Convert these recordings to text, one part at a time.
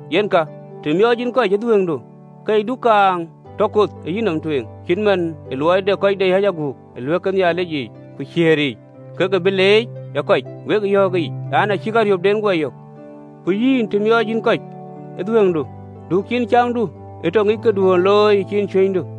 “Yen ka, të miɔɔc yïn kɔc ë dhuëëŋdu, ke yï du kaaŋ tɔ koth ë yïnɔm tueŋ, cït man ë luɔi de kɔc de yic aguk, ë ɣööt ke Nhialic yiic ku kuɛɛr yiic, ke ke bï leec ë kɔc. Wek yɔ̈ɔ̈k ëyic an, “Acïk ariöpden guɔ yök. Ku yïn, të miɔɔc yïn kɔc ë dhuëëŋdu, du ciin camdu ee tɔ ŋic këduön ë looi ë ciin cuënydu,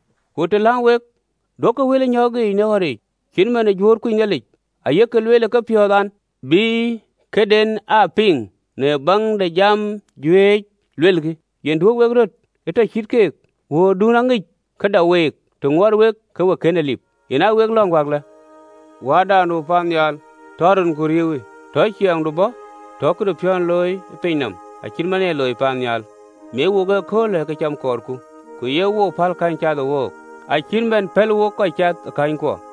Ku të läŋ wek, duökï wël ë nyɔ̈ɔ̈kic në ɣɔ̈ric, cït man ë juöör kuc Nhialic, ayek lueel ë kepiɔ̈ɔ̈th an, bï këden aa piŋ në baŋ de jam juëc luelkï. Yen duö wek röt ee tɔ cït keek, wuöördun aŋic kë dak week të ŋuɔɔt wek ke we kën en lip. Yen aa wek lɔ̈ŋ wäklë: Wääda nu paannhial, Tɔ rinku riëëuwë. Tɔ ciɛɛŋdu bɔ̈, Tɔ këdu piɔ̈ndu ee looi ë piny nɔm, Acït man ë ye looi paannhial. Miɔc wook ëköölë në këcam kɔɔrku, Ku ye wook päl käny cath ë wook, Acït man pɛ̈l wok kɔc cath ë känykuɔ.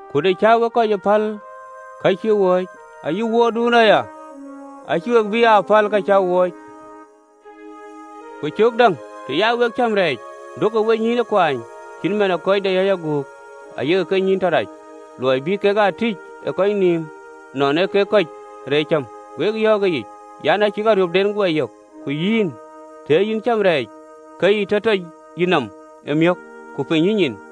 Ku të cä wek kɔc ee päl ka cïk wööc, ayï wuöördun aya acïï we bï aa päl ka cäk wööc. “Ku cöök däŋ, të ya wek cäm rɛɛc, duökï wenyïïn ë kuaany cït man ë kɔc deyiic aguk, ayek kenyïïn tɔ rac, ë luɔi bï kek aa tïc ë kɔc nïïm nɔn ee kek kɔc reec cäm. Wek yɔ̈ɔ̈k ëyic an, “Acïk ariöpden guɔ yök. Ku yïn, të ee yïn cäm rɛɛc, ke yï tɔc yïnɔm ë miök, ku piny yïnyin,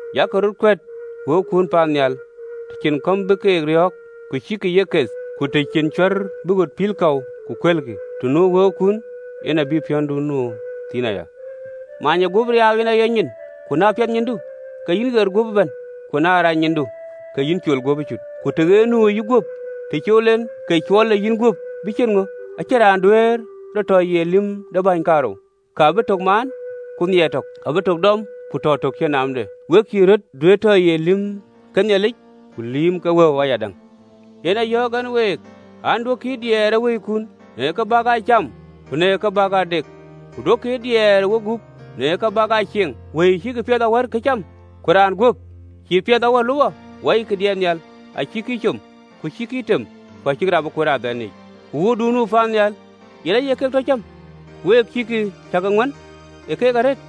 Yak röt kuɛ̈t wëukun paannhial, të cïn kɔ̈m bï ke riɔ̈ɔ̈k ku cïkï ye keth, ku të cïn cuɛ̈ɛ̈r bï ɣöt pil kɔ̈u ku kuëlkï, të nu wëukun, yen abï piɔ̈ndun nu thïn aya. Many ee guöp riaau yen aye nyin, ku na piɛth nyindu, ke yïn ɣer guöp ëbɛ̈n. Ku na rac nyindu, ke yïn col guöp ëcut. Ku na tëɣeer nu ë yïguöp, të cool en, ke cuɔl ë yïnguöp bï ciët ŋö? Acïn raan duëër rɔt tɔ ye lïm de bäny kaarou, ka bï tök maan, ku nhiaar tök, ku abï tök dɔm ku tɔ tök cïn naamde. Wek cïï röt duëër tɔ ye lïïm ke Nhialic ku lïïm ke wëu ayadäŋ. Yen a yɔ̈ɔ̈k ɛn week an, Duökï ë diɛɛr ë wëikun në ke bäk aa cam, ku në ka bäk aa dek, ku duökï ë diɛɛr ë wegup, në ke bäk aa cieŋ, wëi cïkï piɛth awärkï këcam, ku raan guöp cïï piɛth awär lupɔ? Wɔikï diɛt nhial, acïkï ee com, ku acïkï ee tem, ku acïkï rap ee kuöt ë adhɛn yiic, ku wuöörduön nu paannhial yen aye keek tɔ cäm. Ku week, cäkï ŋuän ë keek arëët?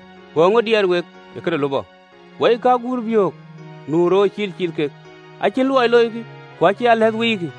Ku eeŋö diɛɛr wek ë këde lupɔ? Wɔikï agurbiök nu roor, cil ciil kek, acïn luɔi loikï, ku acïn alɛɛth wikï,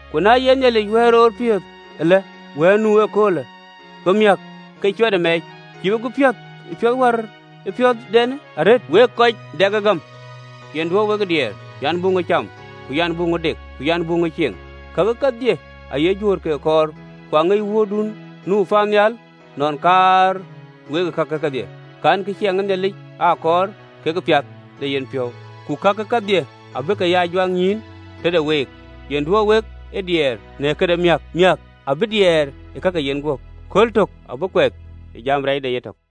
Ku na ye Nhialic wɛ̈ɛ̈l roor piɔ̈th ale, wɛ̈ɛ̈l nu ëköölë, ku miäk ke cuɛtë mɛɛc, cïï we bï piɔ̈th ë piöth wär piöthden arëët, wek kɔc dɛk ë gam? Yen duö wek ë diɛɛr an, “Buk ŋö cam? Ku an, “Buk ŋö dek? Ku an, “Buk ŋö cieŋ? Kake kedhie aye juöör ke kɔɔr, ku aŋic wuöörduön nu paannhial nɔn kaar wek kake kedhie. Kankï ciɛɛŋ de Nhialic aa kɔɔr, kekë piath ë yenpiɔ̈u, ku kakë kedhie abï ke ya juak nyïïn tëde week. Yen duö wek ë diɛɛr në këde miäk, miäk abï diɛɛr ë ka ke yenguöp. Kööl tök abï kuɛth ë jam rɛɛcde yetök.